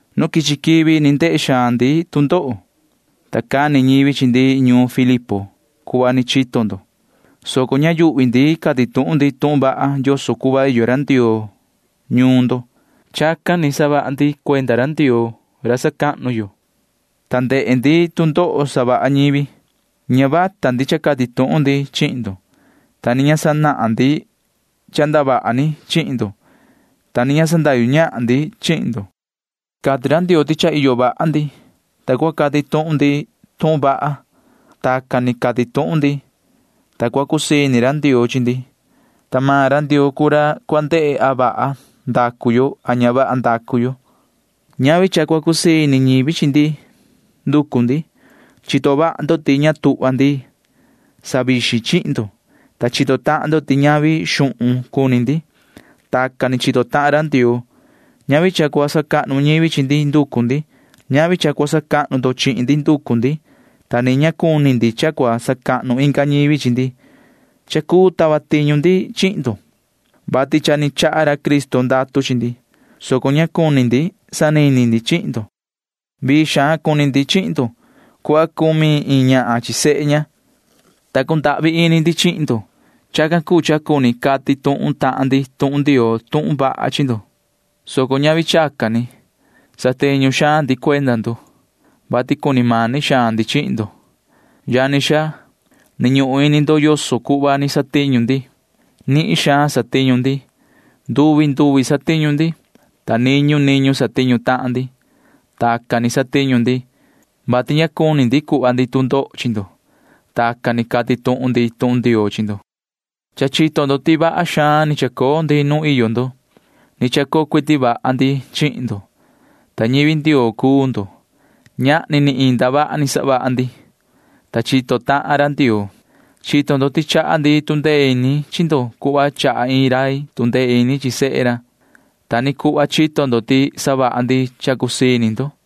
Nu quichi quivi ni ndehe xaan ndi tu ndoho, ta cani ñivi chi ndi ñuun Filipo cuhva ni chito ndo, soco ña yuhvi ndi cati tuhun ndi tuhun vaha yoso cuhva iyo ra Ndioo ñuun ndo. Chacan ni savaha ndi cuenda ra Ndioo ra sacahnu yo, ta ndehe ndi tu ndoho savaha ñivi. Ña vata ndi cha cati tuhun ndi chihin ndo, ta ni ña sanahan ndi cha ndavaha ni chihin ndo, ta ni ña sandahyu ñahan ndi chihin ndo. Cati ra Ndioo ti cha iyo vaha ndi, ta cua cati tuhun ndi tuhun vaha. Tacan ni cati tuhun ndi, ta cua cusii ini ra Ndioo chi ndi, ta maan ra Ndioo cuu ra cua ndehe a vaha yo a ña vaha yo. Ña nducu ndi cuhva cha cua cusii ini ñivi chi ndi. Chito vaha ndo ti ña tuhva ndi savixin ñahan ndi chi ndo, ta chito tahan ndo ti ña cuni ndi cha cuu chachi ñivi. Tacan ni chito tahan ra Ndioo. Ña nducu ndi cha cua sacahnu ñivi chi ndi. Ña nducu ndi cha cua sacahnu maan ndo chihin ndi, ta ni ña cuni ndi cha cua sacahnu inga ñivi chi ndi. Cha cuu tava tiñu ndi chihin ndo, vati cha ni chaha ra Cristo ndatu chi ndi, soco ña cuni ndi sanini ndi chihin ndo. Vii xaan cumi ndi chihin ndo cuhva cumi iin ñahan chi sehe ña, ta cundahvi ini ndi chihin ndo. Chacan cuu cha cuni cati tuhun tahan ndi tuhun Ndioo tuhun vaha chi ndo, soco ñavi chacan ni. Satiñu xaan ndi cuenda ndo, vati cuni mani xaan ndi chihin ndo. Yani xaa, ni ñuhun ini ndo yoso cuhva ni satiñu ndi. Nihin xaan satiñu ndi. Nduvi nduvi satiñu ndi, ta niñu niñu satiñu tahan ndi. Tacan ni satiñu ndi, vati ña cuni ndi cuhva ndi tu ndoho chi ndo. Tacan ni cati tuhun ndi tuhun Ndioo chi ndo. Cha chito ndo ti vaha xaan ni chacoo ndi nu iyo ndo. Ni chacoo cuiti vaha ndi chihin ndo, ta ñivi Ndioo cuu ndo. Ñahni ni iin ndavaha ni savaha ndi. Chacan ni chito tahan ra Ndioo. Chito ndo ti chaha ndi tu ndee ini chi ndo cuhva chaha iin rai tu ndee ini chi sehe ra. Ta ni cuhva chito ndo ti savaha ndi cha cusii ini ndo,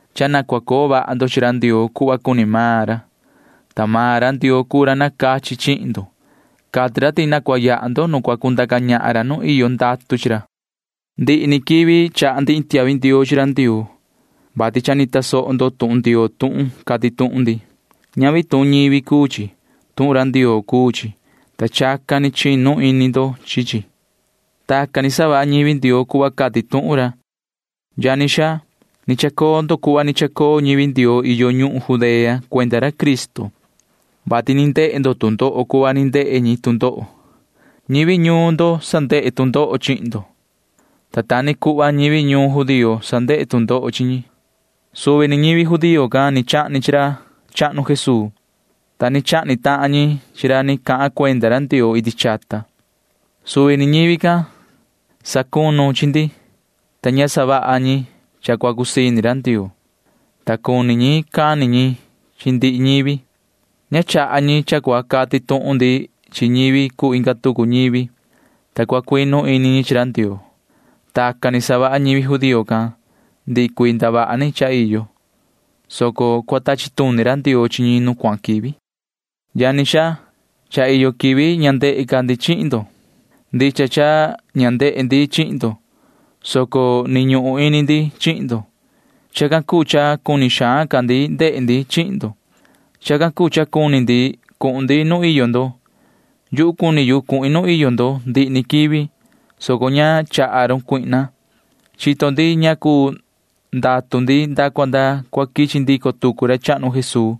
cha na cua coo vaha ndo chi ra Ndioo cuhva cuni maan ra, ta maan ra Ndioo cuu ra nacachi chihin ndo. Cati ra ti na cua yaha ndo nu cua cundaca ñahan ra nu iyo ndatu chi ra. Ndihi ni quivi chaha ndi iin tiahvi ndioo chi ra Ndioo, vati cha ni tasoho ndo tuhun Ndioo tuhun cati tuhun ndi. Ñavi tuhun ñivi cuu chi, vati ndicha ndicha tuhun Ndioo cuu chi, ta chacan ni chinu ini ndo chi chi. Tacan ni savaha ñivi Ndioo cuhva cati tuhun ra. Yani xaa, ni chacoo ndo cuhva ni chacoo ñivi Ndioo iyo ñuhun Judea cuenda ra Cristo, vati ni ndehe ndo tu ndoho cuhva ni ndehe maan ñi tu ndoho. Ñivi ñuun ndo savaha tu ndoho chihin ndo, ta ta ni cuhva ñivi ñuun maan ñi ñivi judío can savaha tu ndoho chi ñi. Suvi ñivi judío can ni chahni chi ra chahnu Jesuu, ta ni chahni tahan ñi chi ra ni cahan cuenda ra Ndioo iti chata. Suvi ni ñivi can sacunu chi ndi, ta ña savaha ñi cha cua cusii ini ra Ndioo, vati cuni cani tahan ñi chi ndihi ñivi. Ña chaha ñi cha cua cati tuhun ndi chi ñivi cuu inga tucu ñivi, ta cua cuinu ini ñi chi ra Ndioo. Tacan ni savaha ñivi judío can ndihi cuii ndavaha ni cha iyo, soco cua tachi tuni ra Ndioo chi ñi nu cuahan quivi. Yani xaa, cha iyo quivi ña ndehe ca ndi chihin ndo. Ndicha cha ña ndehe ndi chihin ndo, soco ni ñuhun ini ndi chihin ndo. Chacan cuu cha cuni xaan ca ndi ndehe tucu ndi chihin ndo. Chacan cuu cha cuni cuhun ndi nu iyo ndo. Yuhu cuni cuhin nu iyo ndo ndihi ni quivi, soco ña chaha run Satanaa. Chito ndi ñacu ndatu ndi nda cua nda cua quichi ndico tucu ra chahnu Jesuu.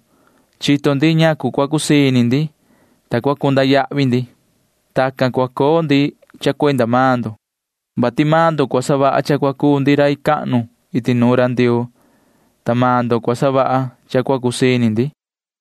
Chito ndi ñacu cua cusii ini ndi, ta chito ndi ñacu cua ndurai ndi. Tacan cua coo ndi cha cuenda maan ndo, vati maan ndo cua savaha cha cua cuu ndi rai cahnu iti nuun ra Ndioo, ta maan ndo cua savaha cha cua cusii ini ndi.